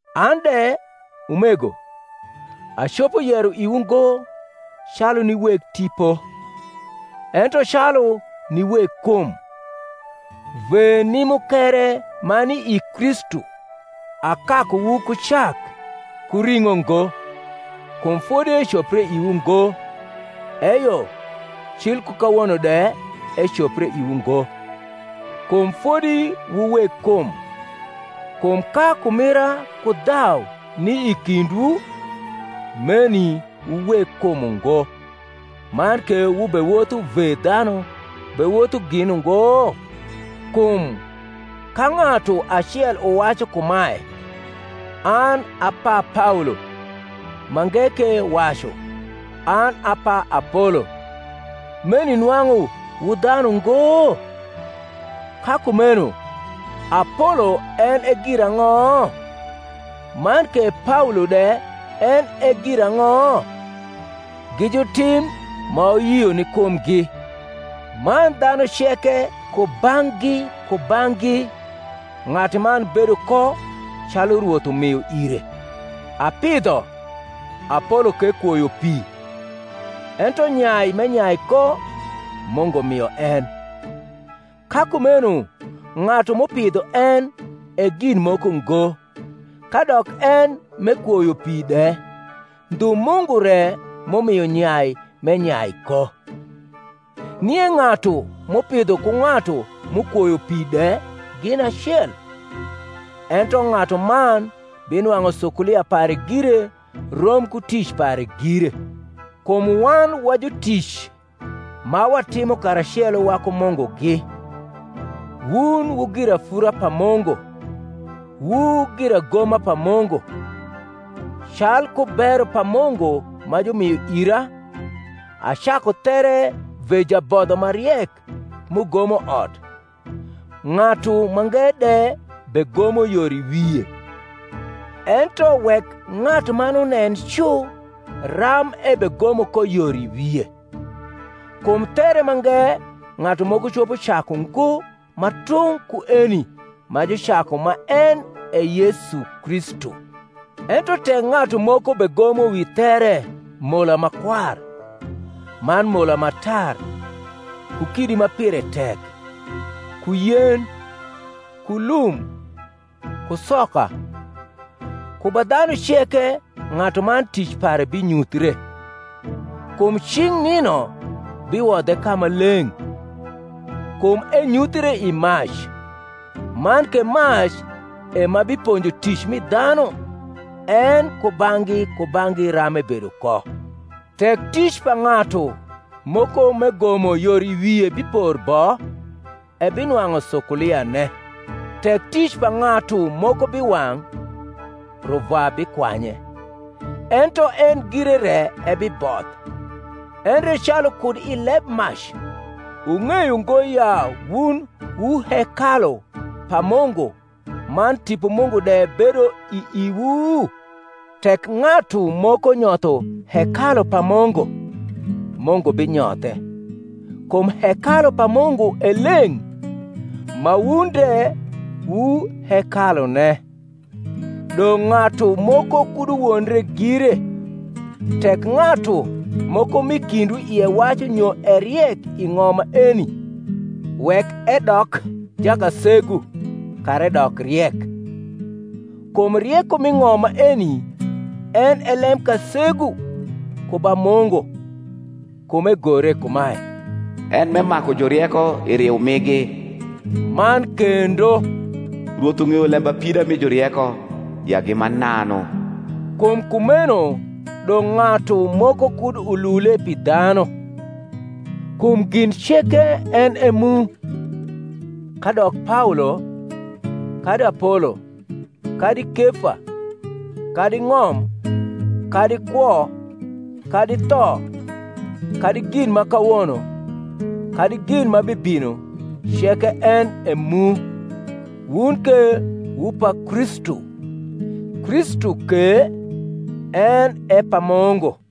An de, umego, acopo yero iwu ngo calu ni weg tipo, ento calu ni weg kum, ve ni mukere ma ni i Kristu. Akakuwu ku cak, ku ring’o ngo; kum fodi ecopre iwu ngo: eyo, cil ku kawono de ecopre iwu ngo; kum fodi wu weg kum: kum ka kumira ku dhau ni i kindwu, meni wu weg kum ungo, man ke wubewotho ve dhanu bewotho gin ungo? Kum ka ng’atu acel uwacu kumae, An a pa Paolo; mange ke wacu, An a pa Apolo: meni nwang’u wu dhanu ngo? Ka kumeno Apolo en e girang’o? man ke Paolo de en e girang’o? Gi jutim ma wuyio ni kumgi; man dhanu ceke kubang’gi kubang’gi ng’atuman bedo ko calu Rwoth umio ire. Apidho, Apolo ke kwoyo pi; ento nyai m’enyai ko Mungu mio en. Ka kumeno ng’atu m’upidho en e gin moko ngo, kadok en m’ekwoyo pi de; ndhu Mungu re m’umio nyai m’enyai ko. Nie ng’atu m’upidho ku ng’atu m’ukwoyo pi de gin acel: ento ng’atuman binwang’u sukulia pare gire rom ku tic pare gire. Kum wan wa jutic ma watimo karacelo waku Mungugi: wun wu girafura pa Mungu, wu giragoma pa Mungu. Calku bero pa Mungu ma jumio ira, acaku there ve jabodho ma riek m’ugomo ot; ng’atu mange de begomo yor i wie. Ento wek ng’atuman unen cu ram ebegomo ko yor i wie. Kum there mange ng’atu moko copo caku ngo ma tung’ ku eni ma jucaku, ma en e Yesu Kristu. Ento tek ng’atu moko begomo wi there mola ma kwar, man mola ma tar, ku kidi ma pire tek, ku yen, ku lum, ku soka; ku ba dhanu ceke ng’atuman tic pare binyuthre: kum cing’ nino biwodhe ka ma leng’, kum enyuthre i mac; man ke mac e ma biponjo tic mi dhanu en kubang’gi kubang’gi ram ebedo ko. Tek tic pa ng’atu moko m’egomo yor i wie bipor bo, ebinwang’u sukuliane. Tek tic pa ng’atu moko biwang’, ruvwa bikwanye: ento en gire re ebiboth; endre calu kud i leb mac. Wung’eyo ngo ya wun wu hekalu pa Mungu, man Tipo Mungu de bedo i iwu? Tek ng’atu moko nyotho hekalu pa Mungu, Mungu binyothe; kum hekalu pa Mungu e leng’, ma wun de wu hekalune. Dong’ ng’atu moko kud uwondre gire. Tek ng’atu moko m’i kindwu ie wacu nyo e riek i ng’om maeni, wek edok jakasegu, kara edok riek. Kum rieko m’i ng’om maeni en e lemkasegu ku ba Mungu. Kum egore kumae, En m’emaku jurieko i riu migi: man kendo, Rwoth ung’eyo lembapida mi jurieko, ya gi mananu. Kum kumeno dong’ ng’atu moko kud ulule pi dhanu. Kum gin ceke en e mu; kadok Paolo, kadi Apolo, kadi Kefa, kadi ng’om, kadi kwo, kadi tho, kadi gin ma kawono, kadi gin ma bibino; ceke en e mu; wun ke wu pa Kristu; Kristu ke en e pa Mungu.